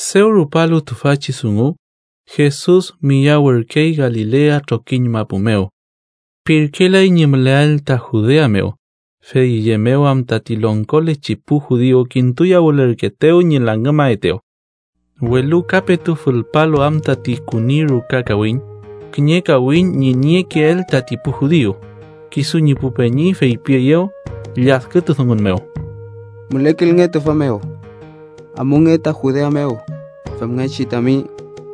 Dew rupalu tüfachi dungu, Jesus miyawürkey Galilea trokiñ mapu mew. Pirkelay ñi müleael ta Judea mew, fey üye mew am tati longkolechi pu judiu kintuyawülürkeetew ñi langümaetew. Welu ka petu fülpalu am tati küni ruka kawiñ, kiñe kawiñ ñi niekeel tati pu judiu, kisu ñi pu peñi feypieyew lladkütudungun mew: —Mülekilnge tüfa mew. Amunge ta Judea mew, femngechi tami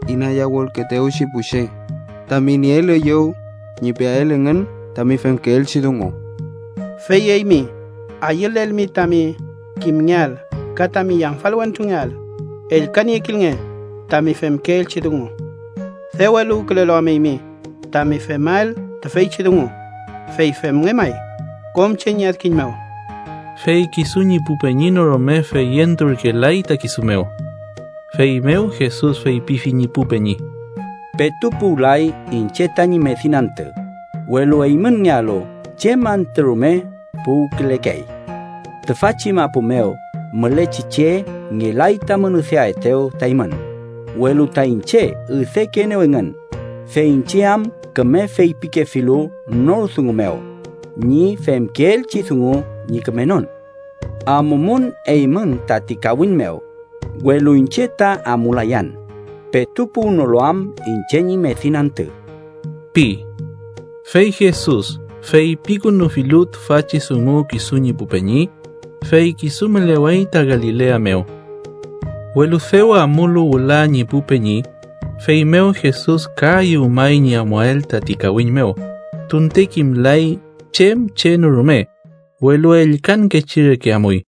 inayawülkeetewchi pu che tami nieel üyew ñi peael engün tami femkeelchi dungu. Fey eymi ayülelmi tami kimngeael ka tami yamfal wentrungeael, ellkaniekilnge tami femkeelchi dungu. Dew eluwkülelu am eymi tami femael tüfeychi dungu, fey femnge may kom che ñi adkiñ mew. Fey kisu ñi pu peñi no rume feyenturkelay ta kisu mew. Feymew Jesus feypifi ñi pu peñi: —Petu puwlay iñche tañi medin antü, welu eymünngealu chem antü rume puwkülekey. Tüfachi mapu mew mülechi che ngelay tamün üdeaetew ta eymün, welu ta iñche üdekeenew engün, fey iñche am küme feypikefilu nor dungun mew ñi femkeelchi dungu ñi kümenon. Amumün eymün tati kawiñ mew, welu iñche ta amulayan, petu puwnolu am iñche ñi medin antü ―pi. Fey Jesus feypikünufilu tüfachi dungu kisu ñi pu peñi, fey kisu mülewey ta Galilea mew. Welu dew amulu wüla ñi pu peñi, feymew Jesus ka ayüwmay ñi amuael tati kawiñ mew, tunte kimlay chem che no rume, welu ellkankechi reke amuy.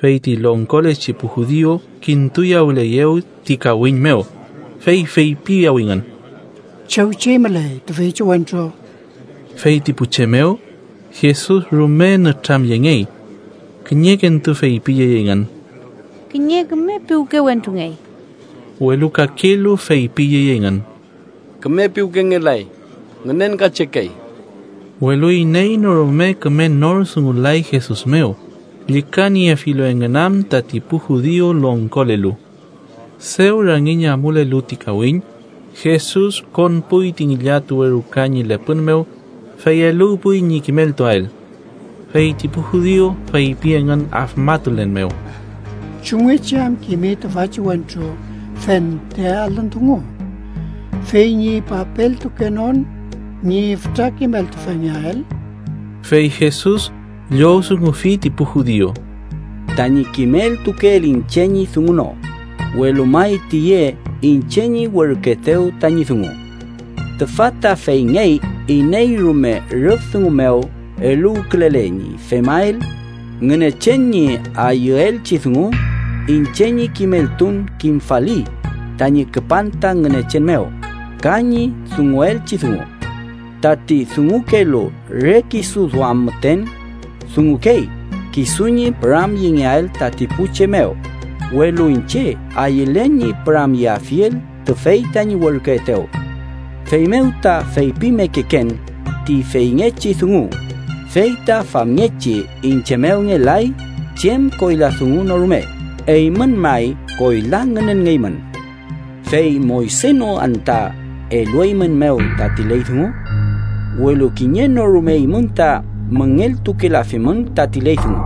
Fey ti longkolechi pu judiu kintuyawüleyew ti kawiñ mew, fey feypiyawingün: —¿Chew chey müley tüfeychi wentru? Fey ti pu che mew, Jesus rume nütramyengey. Kiñekentu feypiyey engün: “Kiñe küme piwke wentrungey”. Welu kakelu feypiyey engün: “Küme piwkengelay, ngünenkachekey”. Welu iney no rume küme nor dungulay Jesus mew, llükaniefilu engün am tati pu judiu longkolelu. Dew rangiñ amulelu ti kawiñ, Jesus konpuy ti ngillatuwe ruka ñi lepün mew, fey eluwpuy ñi kimeltuael. Fey ti pu judiu feypi engün afmatulen mew: —¿Chumngechi am kimi tüfachi wentru fente alün dungu fey ñi papeltukenon ñi fütra kimeltufengeael? Fey Jesus llowdungufi ti pu judiu: —Tañi kimeltukeel iñche ñi dungu no, welu may tüye iñche ñi werküetew tañi dungu. Tüfa ta feyngey iney rume rüf dungu mew eluwkülele ñi femael Ngünechen ñi ayüelchi dungu, iñche ñi kimeltun kimfali tañi küpan ta Ngünechen mew ka ñi dunguelchi dungu. Tati dungukelu re kisu duam müten, dungukey kisu ñi püramyengeael tati pu che mew, welu iñche ayülen ñi püramyeafiel tüfey tañi werküetew, feymew ta feypimekeken ti feyngechi dungu, fey ta famngechi iñche mew ngelay chem koyla dungu no rume eymün may koyla ngünenngeymün. “¿Fey Moyse no anta elueymünmew tati ley dungu? Welu kiñe no rume eymün ta müngeltukelafimün tati ley dungu.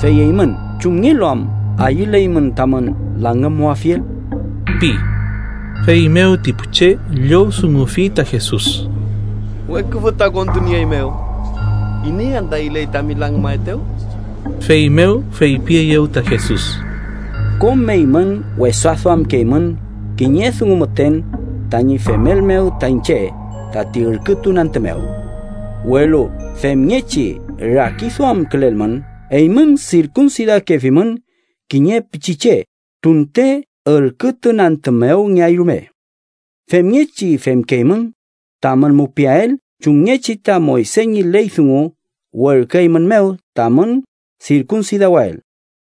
Fey eymün, ¿chumngelu am ayüleymün tamün langümmuafiel?” pi. Feymew ti pu che llowdungufi ta Jesus: —¡Weküfü ta kontunieeymew! ¿Iney anta ayüley tami langümaetew? Feymew feypieyew ta Jesus: —Kom eymün wesa duamkeymün kiñe dungu müten tañi femel mew ta iñche tati ürkütun antü mew. Welu femngechi rakiduamkülelmün, eymün, sirkunsidakefimün kiñe pichiche tunte ürkütun antü mew ngeay rume. Femngechi femkeymün tamün mupiael chumngechi ta Moyse ñi ley dungu werküeymünmew tamün sirkunsidawael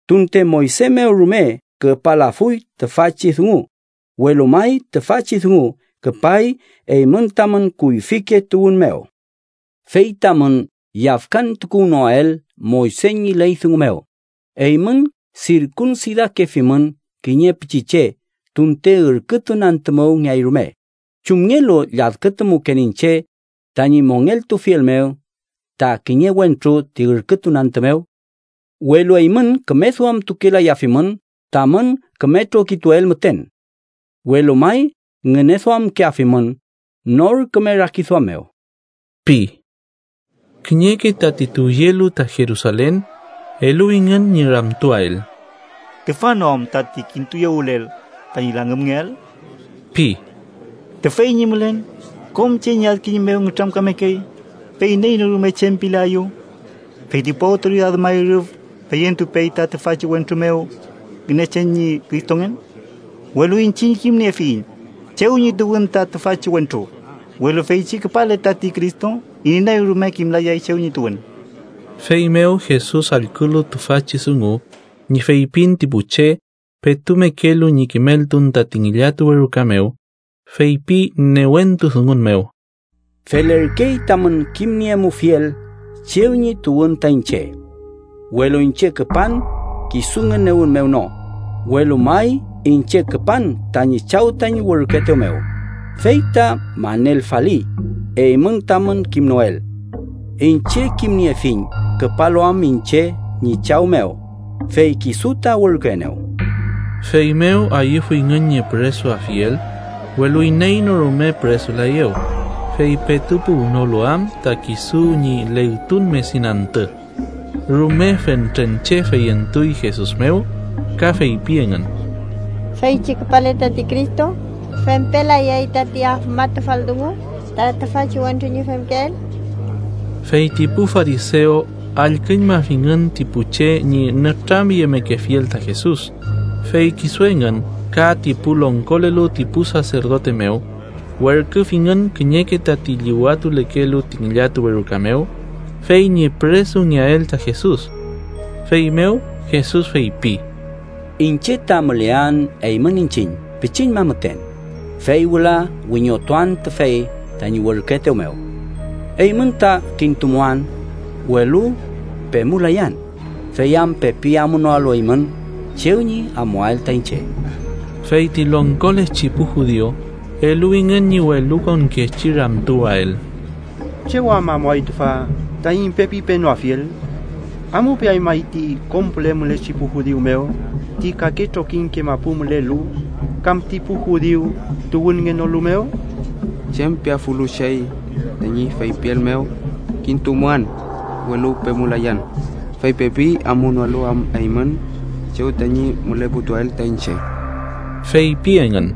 (tunte Moyse mew rume küpalafuy tüfachi dungu, welu may tüfachi dungu küpay eymün tamün kuyfike tuwün mew). Fey tamün yafkantukuwnoael Moyse ñi ley dungu mew, eymün sirkunsidakefimün kiñe pichiche tunte ürkütun antü mew ngeay rume, ¿chumngelu lladkütumuken iñche tañi mongeltufiel mew ta kiñe wentru ti ürkütun antü mew? Welu eymün küme duamtukelayafimün tamün küme trokituel müten. Welu may ngüneduamkeafimün nor küme rakiduam mew ―pi. Kiñeke tati tuwyelu ta Jerusalen eluwingün ñi ramtuael: “¿Tüfa no am tati kintuyawülel tañi langümngeael? pi. Tüfey ñi mülen, kom che ñi adkiñ mew nütramkamekey, fey iney no rume chem pilaeyew. ¿Fey ti pu awtoridad may rüf feyentupey ta tüfachi wentru mew Ngünechen ñi Cristongen? Welu iñchiñ kimniefiyiñ chew ñi tuwün ta tüfachi wentru, welu feychi küpale tati Cristo, iney rume kimlayay chew ñi tuwün.” Feymew Jesus allkülu tüfachi dungu ñi feypin ti pu che, petu mekelu ñi kimeltun tati ngillatuwe ruka mew, feypi newentu dungun mew: —¡Felerkey tamün kimniemufiel chew ñi tuwün ta iñche! Welu iñche küpan kisu ngünewün mew no, welu may iñche küpan tañi Chaw tañi werküetew mew, fey ta manelfali, eymün tamün kimnoel. Iñche kimniefiñ küpalu am iñche ñi Chaw mew, fey kisu ta werküenew. Feymew ayüfuyngün ñi püresuafiel, welu iney no rume püresulaeyew, fey petu puwnolu am ta kisu ñi legtun medin antü. Rume fentren che feyentuy Jesus mew, ka feypi engün: “Feychi küpale tati Cristo, ¿fempelayay tati afmatufal dungu ta tüfachi wentru ñi femkeel?” Fey ti pu farisew allküñmafingün ti pu che ñi nütramyemekefiel ta Jesus, fey kisu engün ka ti pu longkolelu ti pu saserdote mew werküfingün kiñeke tati llüwatulekelu ti ngillatuwe ruka mew, fey ñi püresungeael ta Jesus. Feymew Jesus feypi: —Iñche ta mülean eymün iñchiñ pichiñma müten, fey wüla wiñotuan tüfey tañi werküetew mew. Eymün ta kintumuan, welu pemulayan, fey am pepi amunoalu eymün chew ñi amuael ta iñche. Fey ti longkolechi pu judiu eluwingün ñi welukonkechi ramtuwael: “¿Chew am amuay tüfa, taiñ pepi penoafiel? ¿Amupeay may ti kom püle mülechi pu judiu mew ti kake trokiñke mapu mülelu, kam ti pu judiu tuwünngenolu mew? ¿Chem piafulu chey tañi feypiel mew, ‘Kintumuan, welu pemulayan, fey pepi amunoalu am eymün chew tañi müleputuael ta iñche’?” feypi engün.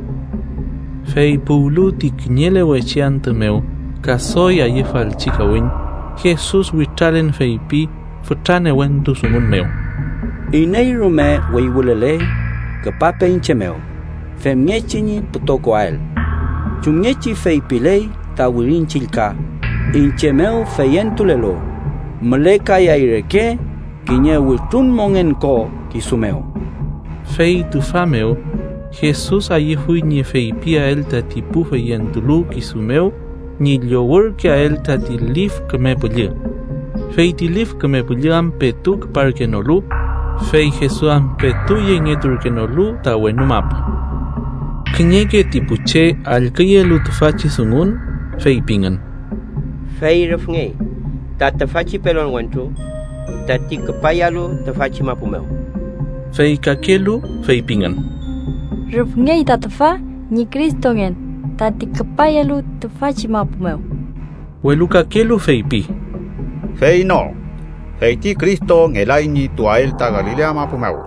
Fey puwlu ti kiñelewechi antü mew ka doy ayüfalchi kawiñ, Jesus witralen feypi fütra newentu dungun mew: —Iney rume wüywülele, küpape iñche mew, femngechi ñi pütokoael. Chumngechi feypiley ta Wirin Chillka, iñche mew feyentulelu, mülekayay reke kiñe wütrun mongen ko kisu mew. Fey tüfa mew, Jesus ayüfuy ñi feypiael tati pu feyentulu kisu mew ñi llowürkeael tati Lif Küme Püllü. Fey ti Lif Küme Püllü am petu küparkenolu, fey Jesus am petu yengeturkenolu ta wenu mapu. Kiñeke ti pu che allküyelu tüfachi dungun, feypingün: “Fey rüfngey ta tüfachi pelon wentru tati küpayalu tüfachi mapu mew.” Fey kakelu feypingün: “Rüfngey ta tüfa ñi Cristongen tati küpayalu tüfachi mapu mew.” Welu kakelu feypi: “Fey no, fey ti Cristo ngelay ñi tuwael ta Galilea mapu mew.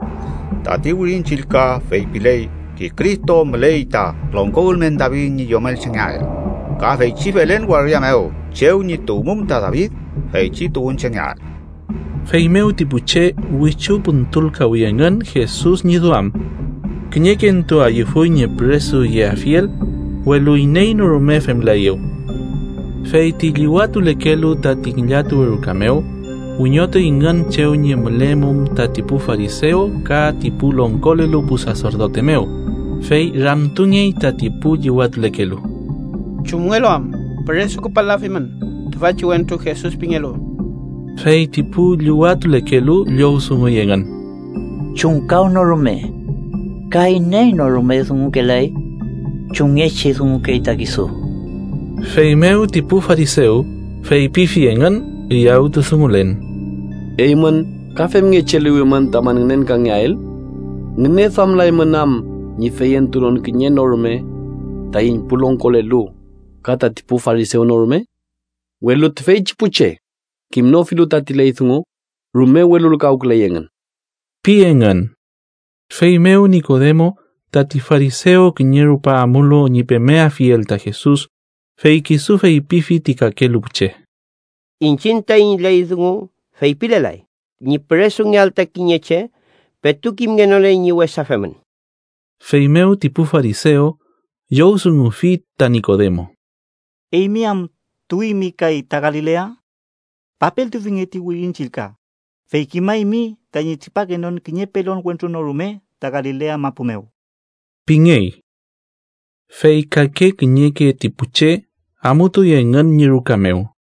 Tati Wirin Chillka feypiley ti Cristo müley ta longko ülmen David ñi yomelchengeael, ka feychi Belen waria mew chew ñi tuwmum ta David, feychi tuwünchengeael.” Feymew ti pu che wichu püntülkawi engün Jesus ñi duam. Kiñekentu ayüfuy ñi püresuyeafiel, welu iney no rume femlaeyew. Fey ti llüwatulekelu tati ngillatuwe ruka mew, wiñotuyngün chew ñi mülemum tati pu farisew ka ti pu longkolelu pu saserdote mew, fey ramtungey tati pu llüwatulekelu: —¿Chumngelu am püresu küpal-lafimün tüfachi wentru Jesus pingelu? Fey ti pu llüwatulekelu llowdunguy engün: —¡Chumkawnorume ka iney no rume dungukelay chumngechi dungukey ta kisu! Feymew ti pu farisew feypifi engün üyawtudungulen: —¿Eymün ka femngechi eluwimün tamün ngünenkangeael? ¿Ngüneduamlaymün am ñi feyentunon kiñe no rume taiñ pu longkolelu, ka tati pu farisew no rume? Welu tüfeychi pu che kimnofilu tati ley dungu, rume welulkawküley engün ―pi engün. Feymew Nikodemo, tati farisew kiñe rupa amulu ñi pemeafiel ta Jesus, fey kisu feypifi ti kakelu pu che: —Iñchiñ taiñ ley dungu feypilelay ñi püresungeael ta kiñe che, petu kimngenole ñi wesa femün. Feymew ti pu farisew llowdungufi ta Nikodemo: —¿Eymi am tuwimi kay ta Galilea? Papeltufinge ti Wirin Chillka, fey kimaymi tañi tripakenon kiñe pelon wentru no rume ta Galilea mapu mew ―pingey. ( Fey kake kiñeke ti pu che amutuy engün ñi ruka mew.